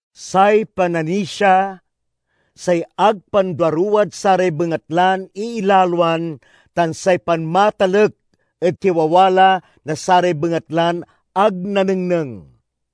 Say pananisia say ag panduaruwad saray bengatlan iilaloan tan say panmatalek ed kiwawala na saray bengatlan ag nanengneng.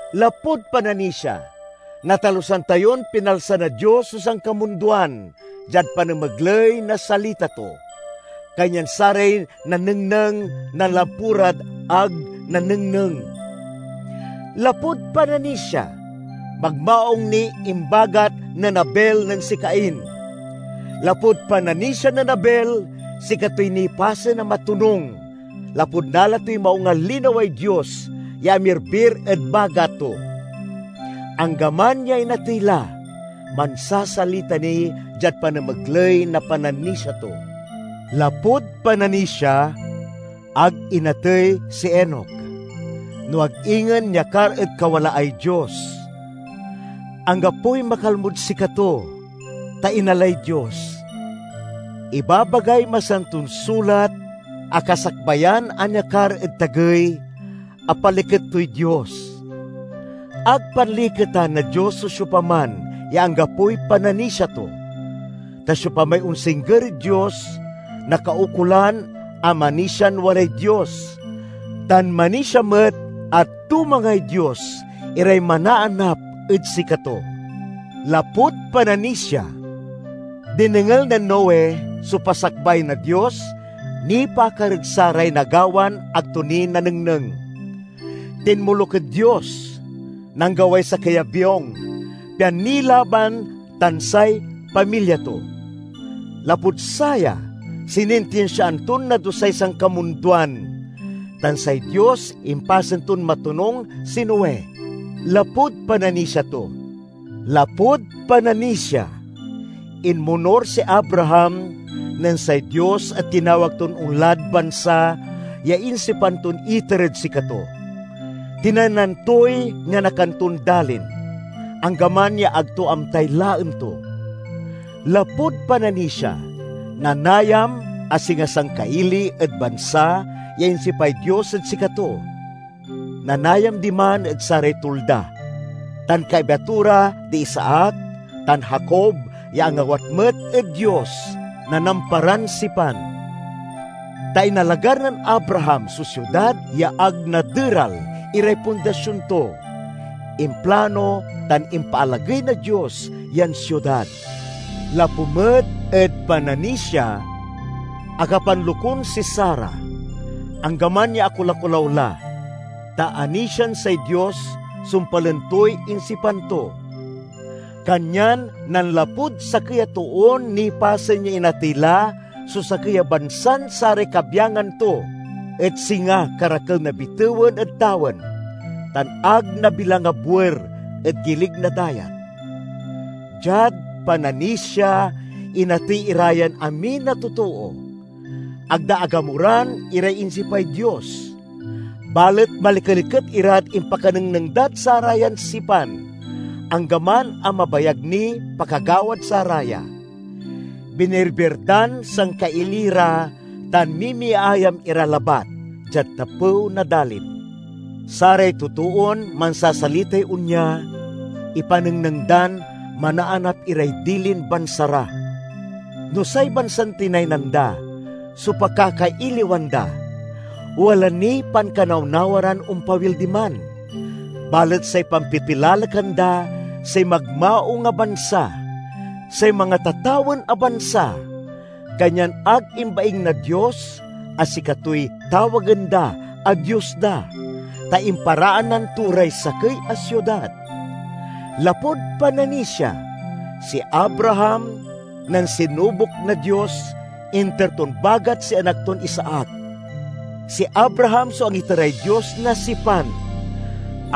Lapud pananisia, natalusan tayon pinalsa na Dios so sankamundoan diad panamegley na salita to; kanyan saray nanengneng nanlapu rad ag nanengneng. Lapud pananisia, magmaung niy imbagat nen Abel nen si Cain. Lapud pananisia nen Abel, sikatoy nipasen a matonung lapud nala toy maung a linaway Dios ya amirbir ed bagat to. Anggaman ya inatey la, mansasalita ni diad panamegley na pananisia to. Lapud pananisia, ag inatey si Enoc, no ag ingen niakar ed kawalaay Dios. Anggapoy makalmod sikato, ta inalay Dios. Ibabagay Masanton Sulat a kasakbayan a niakar ed tagey, apaliket toy Dios. Ag panliketan na Dios so siopaman ya anggapoy pananisia to. Ta siopamay onsingger ed Dios, nakaukolan a manisian walay Dios, tan manisia met a tumangay Dios iray manaanap ed sikato. Lapud pananisia, dinengel nen Noe so pasakbay na Dios nipaakar ed saray nagawan ag to ni nanengneng. Tinmoluk ed Dios; nanggaway sakey a biong, pian nilaban tan say pamilya to. Lapud saya, sinintinsiaan ton nadusay sankamundoan, tan say Dios impasen ton matonung si Noe lapud pananisia to. Lapud pananisia, inmonur si Abraham nen say Dios et tinawag ton onlad bansa ya insipan ton iter ed sikato. Tinaynan toy nianakan ton dalin, anggaman ya ag to amtay laen to. Lapud pananisia, nanayam a singa sangkaili ed bansa ya insipay Dios ed sikato. Nanayam diman ed saray tulda, tan kaiba to ra di Isaac tan Jacob ya angawat met ed Dios na namparan sipan. Ta inalagar nen Abraham so siudad ya ag naderal iray pundasion to. Implano tan impaalagey na Dios yan siudad. Lapu met ed pananisia, akapanlokun si Sara, anggaman ya akolakolaw la, ta anisian say Dios sumpalen toy insipan to. Kanyan nanlapud sakey a toon nipasen ya inatey la so sakey a bansan saray kabyangan to et singa karakel na bitewen ed tawen, tan ag nabilang a buer ed gilig na dayat. Diad pananisia, inatey ira yan amin a totoo. Ag da agamuran iray insipay Dios, balet malikeliket irad impakanengneng dad sarayan sipan, anggaman a mabayag niy pakagawad saraya. Binirbir dan sangkaili ra tan mimiayam ira labat diad tapew na dalin. Saray totoon mansasalitay onya ipanengneng dan manaanap iray dilin bansa ra. No say bansan tinaynan da so pakakailiwan da, wala niy pankanawnawa ran ompawil diman. Balet say pampipilalekan da say magmaung a bansa—say mangatatawen a bansa. Kanyan ag imbaing na Dios a sikatoy tawagen da a Dios da, ta imparaanan to ray sakey a siudad. Lapud pananisia, si Abraham, nen sinubok na Dios, inter ton bagat si anak ton Isaac. Si Abraham so angiteray Dios na sipan;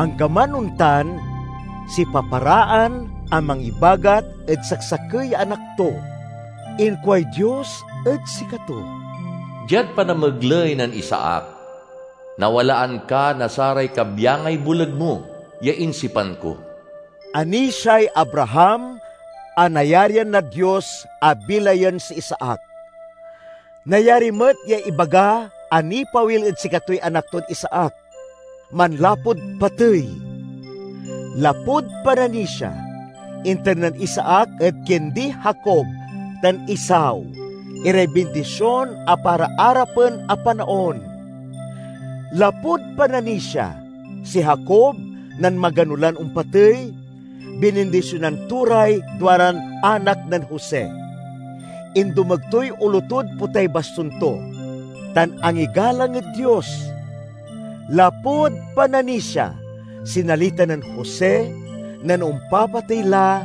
anggaman ontan, sipaparaan a mangibagat ed saksakey ya anak to. Inkuay Dios ed sikato, "Diad panamegley nen Isaac, nawalaan ka na saray kabyangay boleg mo ya insipan ko." Anisiay Abraham a nayarian na Dios a bilayen si Isaac. Nayari met ya ibaga a nipawil ed sikatoy anak ton Isaac manlapud patey. Lapud pananisia, inter nen Isaac ed kindi Jacob tan Esau iray bindision a para arapen a panaon. Lapud pananisia, si Jacob, nen magano lan ompatey, binindisionan to ray duaran anak nen Jose. Indomeg toy olo tod potay bastun to, tan angigalang ed Dios. Lapud pananisia, sinalita nen Jose, nen ompapatey la,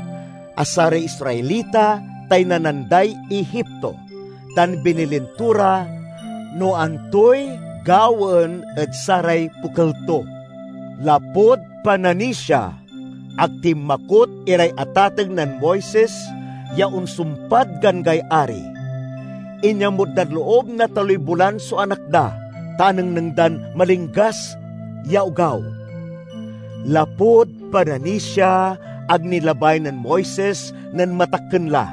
a saray Israelita taynanan day Egipto, tan binilin to ra no antoy gawaen ed saray pokel to. Lapud pananisia, ag tinmakot iray atateng nen Moises ya onsumpad ganggay ari. Inyamut dad loob na taloy bolan so anak da, ta anengneng dan malinggas ya ogaw. Lapud pananisia, ag nilabay nen Moises, nen matakken la,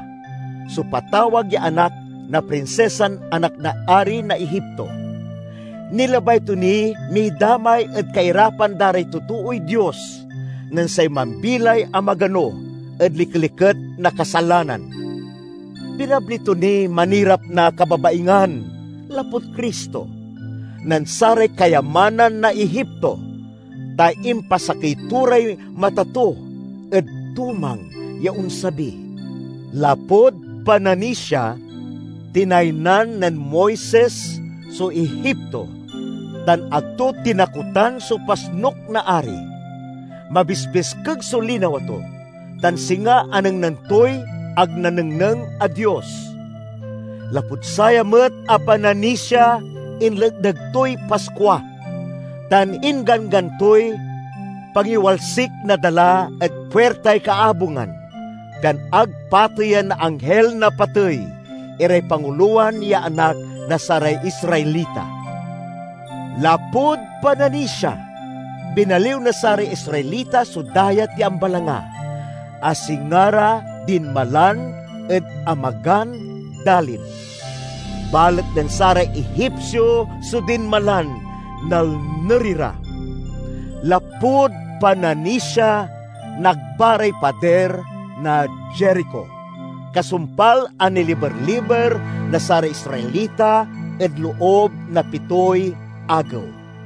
so patawag ya anak na prinsisan anak na ari na Egipto. Nilabay to niy midamay ed kairapan da ray totooy Dios nen say mambilay a magano ed likeliket na kasalanan. Pinabli to niy manirap na kababaingan, lapud Cristo, nen saray kayamanan na Egipto, ta impasakey to ray mata to ed tumang ya onsabi. Lapud pananisia, tinaynan nen Moises so Egipto tan ag to tinakotan so pasnuk na ari; mabisbiskeg so linawa to, tan singa anengneng toy ag nanengneng a Dios. Lapud saya met a pananisia inletneg toy Paskua, tan ingganggan toy pangiwalsik na dala ed puirtay kaabungan, pian ag pateyen na Anghil na Patey iray pangulowan ya anak na saray Israelita. Lapud pananisia, binaliw na saray Israelita so Dayat ya Ambalanga a singa ra dinmalan ed amagan dalin. Balet nen saray Egipsio so dinmalan, nalner ira. Lapud pananisia, nagba ray padir na Jerico, kasumpal a niliber-liber na saray Israelita ed loob na pitoy agew.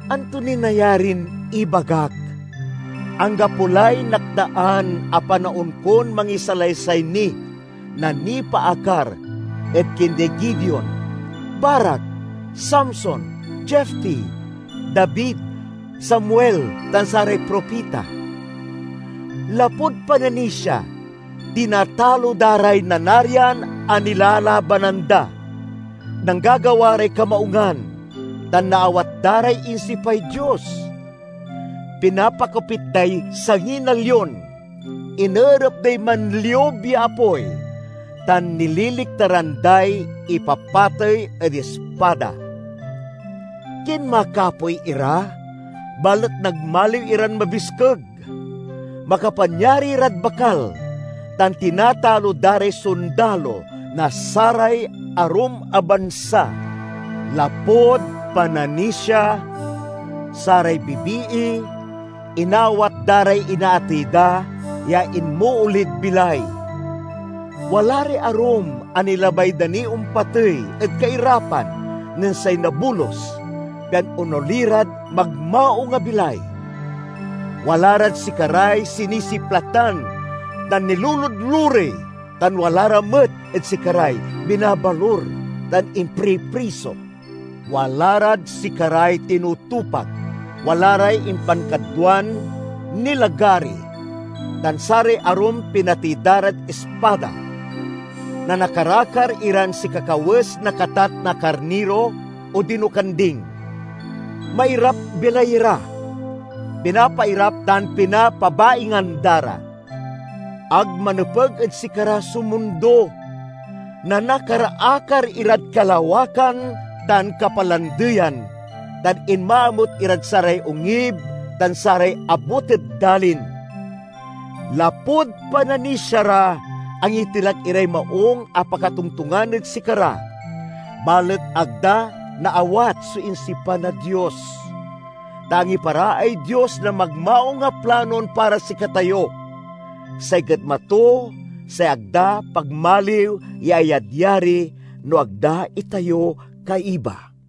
Anto niy nayarin ibagak? Anggapo lay nakdaan a panaon kon mangisalaysay ni na nipaakar ed kindi Gideon, Barac, Samson, Jefte, David, Samuel, tan saray propita. Lapud pananisia, tinatalo da ray nanarian a nilalabanan da. Nanggagawa ray kamaungan, tan naawat da ray insipay Dios. Pinapakopit day sangi na lion, ineerep day manliub ya apoy, tan nililiktaran day ipapatey ed ispada. Kinmakapoy ira, balet nagmamaliw iran mabiskeg; makapanyari rad bakal tan tinatalo da ray sondalo na saray arum a bansa. Lapud pananisia, saray bibii inaawat da ray inaatey da ya inmoolid bilay. Wala ray arum a nilabay da niy ompatey ed kairapan nen say nabolus, pian onoli rad magmaung a bilay. Wala rad sikaray sinisiplatan tan niluludlurey, tan wala ra met ed sikaray binabalur tan impripriso. Wala rad sikaray tinutupak, wala ray impankadwan nilagari, tan saray arum pinatey da rad ispada. Nanakar-akar iran sikakawes na katat na karniro odino kanding; mairap-bilay ira, pinapairap tan pinapabaingan da ra. Ag manepeg ed sikara so mundo! Nanakar-akar irad kalawakan tan kapalandeyan, tan inmaamut irad saray ongib tan saray abut ed dalin. Lapud pananisia ra, angitilak iray maung a pakatongtongan ed sikara, balet ag da naawat so insipan na Dios, ta angiparaay Dios na magmaung a planon para sikatayo. Say getma to say ag da pagmaliw ya ayadyari no ag da itayo kaiba.